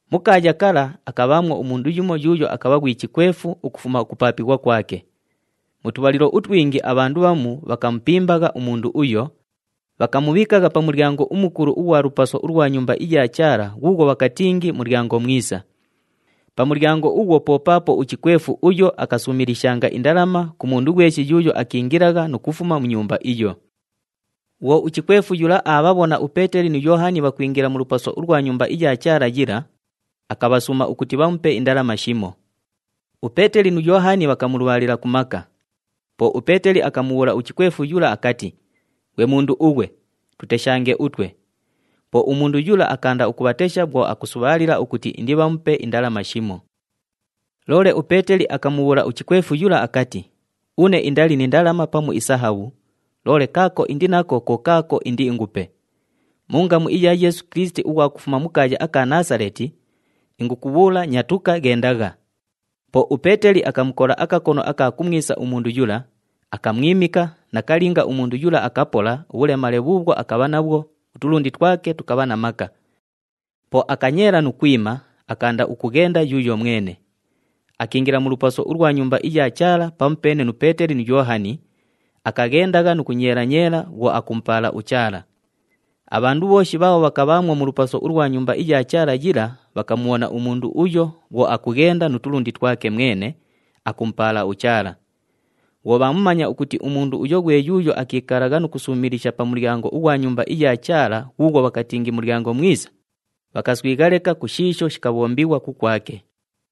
Mu kaaya kala akabhaamwo umundu yumo yuuyo akabha ghwi chikwefu ukufuma ukupaapighwa kwake. Mu tubhalilo utwingi abhandu bhamu bhakamupimbagha umundu uyo, bhakamubhiikagha pa mulyango umukulu ughwa lupaso ulwa Nyumba iya Chaala ghuughwo bhakatingi Mulyango Mwisa. Pa mulyango ughwo po paapo uchikwefu uyo akasuumilishanga indalama ku mundu ghweshi yuuyo akiingilagha nu kufuma mu Nyumba iyo. Bhwo uchikwefu yula aabhabhona uPeeteli nu Yoohani bhakwingila mu lupaso ulwa Nyumba iya Chaala yila, akabhasuuma ukuti bhamupe indalama shimo. UPeeteli nu Yoohani bhakamulubhaalila ku maka. Po uPeeteli akamubhuula uchikwefu yula akati, “Ghwe mundu ughwe, tuteshange utwe!” Po umundu yula akaanda ukubhatesha bhwo akusubhaalila ukuti indibhamupe indalama shimo. Loole uPeeteli akamubhuula uchikwefu yula akati, “Une indali ni ndalama pamu isahabhu, loole kaako indi nako ko kaako indiingupe. Mu ngamu iya Yeesu Kilisiti ughwa kufuma mu kaaya aka Naasaleeti, ingukubhuula, nyatuka, ghendagha!” Po uPeeteli akamukola akakono aka kumwisa umundu yula, akamwimika, nakalinga umundu yula akapola ubhulemale bhuubhwo akabha nabhwo, utulundi twake tukabha na maka. Po akanyeela nu kwima, akaanda ukughenda yuuyo mwene. Akiingila mu lupaso ulwa Nyumba iya Chaala pamupeene nu Peeteli nu Yoohani, akaghendagha nu kunyeela-nyeela bhwo akumupaala uChaala. Abhandu bhooshi bhaabho bhakabhaamwo mu lupaso ulwa Nyumba iya Chaala yila bhakamubhona umundu uyo bhwo akughenda nu tulundi twake mwene, akumupaala uChaala. Bhwo bhaamumanya ukuti umundu uyo ghwe yuuyo akiikalagha nu kusuumilisha pa mulyango ughwa Nyumba iya Chaala ghuughwo bhakatingi Mulyango Mwisa, bhakaswigha leka ku shiisho shikabhombighwa kukwake.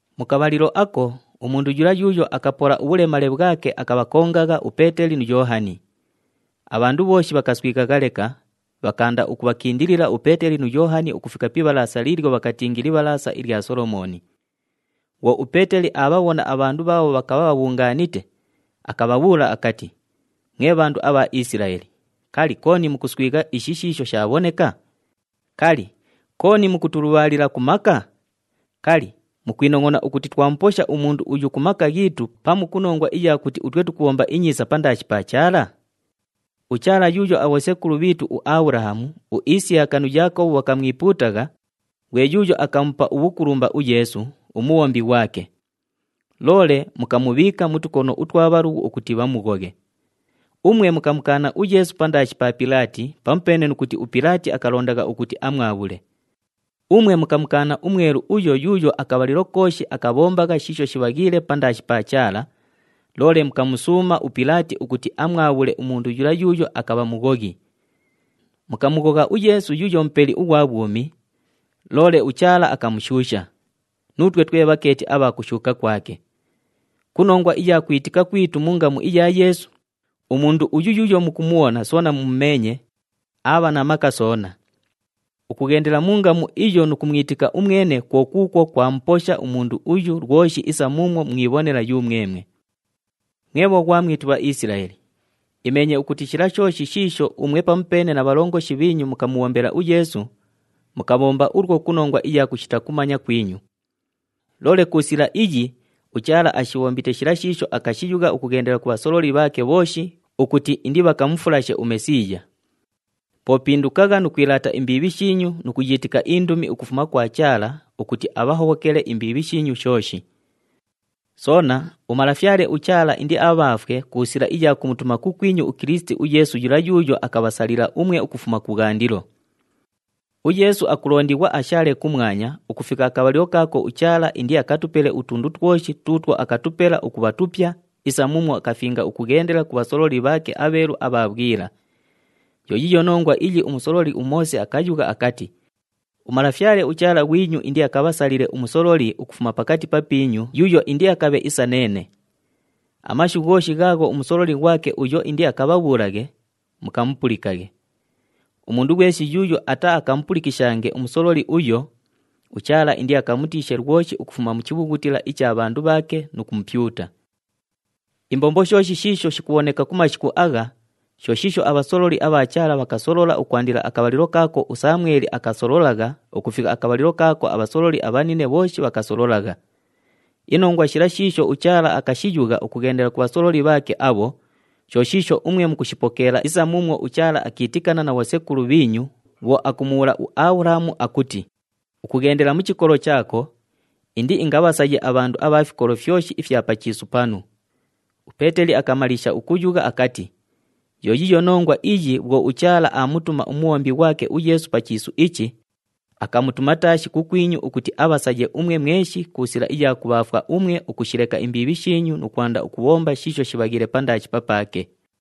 Mu kabhalilo ako, umundu yula yuuyo akapola ubhulemale bhwake akabhakongagha uPeeteli nu Yoohani. Abhandu bhooshi bhakaswighagha leka, bhakaanda ukubhakindilila uPeeteli nu Yoohani ukufika pi ibhalaasa liilyo bhakatingi Libhalaasa ilya Solomooni. Bhwo uPeeteli aabhabhona abhandu bhaabho bhakabha bhabhungaanite, akabhabhuula akati, “Mwe bhandu abha Isilaeli, kali, kooni mukuswigha ishi shiisho shaabhoneka? Kali, kooni mukutulubhaalila ku maka? Kali, mukwinongʼona ukuti twamuposha umundu uyu ku maka ghiitu, pamu ku nongwa iya kuti utwe tukubhomba inyiisa pandaashi pa Chaala? UChaala yuuyo abhosekulu bhiitu uAbhulahamu, uIsiyaka nu Yaakobhu bhakamwipuutagha, ghwe yuuyo akamupa ubhukulumba uYeesu, uMubhombi ghwake. Loole mukamubhiika mu tukono utwa bhalughu ukuti bhamughoghe. Umwe mukamukaana uYeesu pandaashi pa Pilaati pamupeene nu kuti uPilaati akalondagha ukuti amwabhule. Umwe mukamukaana uMwelu uyo yuuyo akabhalilo kooshi akabhombagha shiisho shibhaghiile pandaashi pa Chaala, loole mukamusuuma uPilaati ukuti amwabhule umundu yula yuuyo akabha mughoghi. Mukamughogha uYeesu yuuyo Mupeli ughwa bhwumi, loole uChaala akamushuusha. Nuutwe twe bhakeeti abha kushuuka kwake. Ku nongwa iya kwitika kwitu mu ngamu iya Yeesu, umundu uyu yuuyo mukumubhona soona mumumeenye, aabha na maka soona. Ukughendela mu ngamu iyo nu kumwitika umwene kwo kuukwo kwamuposha umundu uyu lwoshi isa muumwo mwibhonela yumwemwe. “Mwe bhoghwamwitu, Bhaisilaeli, imeenye ukuti shila shooshi shiisho umwe pamupeene na bhalongoshi bhiinyu mukamubhombela uYeesu, mukabhomba ulwo ku nongwa iya kushita kumanya kwinyu. Loole ku sila iyi uChaala ashibhombite shila shiisho akashiyugha ukughendela ku bhasololi bhaake bhooshi ukuti indibhakamufulashe uMesiiya. Po pindukagha nu kwilaata imbiibhi shiinyu nu kuyiitika indumi ukufuma kwa Chaala ukuti abhahobhokele imbiibhi shiinyu shooshi. Soona, uMalafyale uChaala indiabhaafwe ku sila iya kumutuma kukwinyu uKilisiti uYeesu yula yuuyo akabhasalila umwe ukufuma kubhwandilo. UYeesu akulondighwa ashaale kumwanya ukufika akabhalilo kaako uChaala indiakatupele utundu twoshi tuutwo akatupela ukubha tupya isa muumwo akafinga ukughendela ku bhasololi bhaake abheelu abha bhwila. Yo yiiyo nongwa iyi umusololi uMoose akayugha akati, ‘UMalafyale uChaala ghwinyu indiakabhasalile umusololi ukufuma pakati papiinyu yuuyo indiakabhe isa neene. Amashu ghooshi ghaagho umusololi ghwake uyo indiakabhabhuulaghe, mukamupulikaghe. Umundu ghweshi yuuyo ataaakamupulikishange umusololi uyo, uChaala indiakamutiishe lwoshi ukufuma mu chibhughutila icha bhandu bhaake nu kumupyuta.’ “Imbombo shooshi shiisho shikubhoneka ku mashiku agha, sho shiisho abhasololi abha Chaala bhakasolola ukwandila akabhalilo kaako uSamweli akasololagha ukufika akabhalilo kaako abhasololi abhanine bhooshi bhakasololagha. Inongwa shila shiisho uChaala akashiyugha ukughendela ku bhasololi bhaake abho, sho shiisho umwe mukushipokeela isa muumwo uChaala akiitikana na bhosekulu bhiinyu bhwo akumubhuula uAbhulahamu akuti, ‘Ukughendela mu chikolo chaako, indiingabhasaye abhandu abha fikolo fyoshi ifya pa chiisu panu.’” UPeeteli akamaliisha ukuyugha akati, “Yo yiiyo nongwa iyi bhwo uChaala aamutuma uMubhombi ghwake uYeesu pa chiisu ichi, akamutuma taashi kukwinyu ukuti abhasaye umwe mweshi ku sila iya kubhaafwa umwe ukushileka imbiibhi shiinyu nu kwanda ukubhomba shiisho shibhaghiile pandaashi papaake.”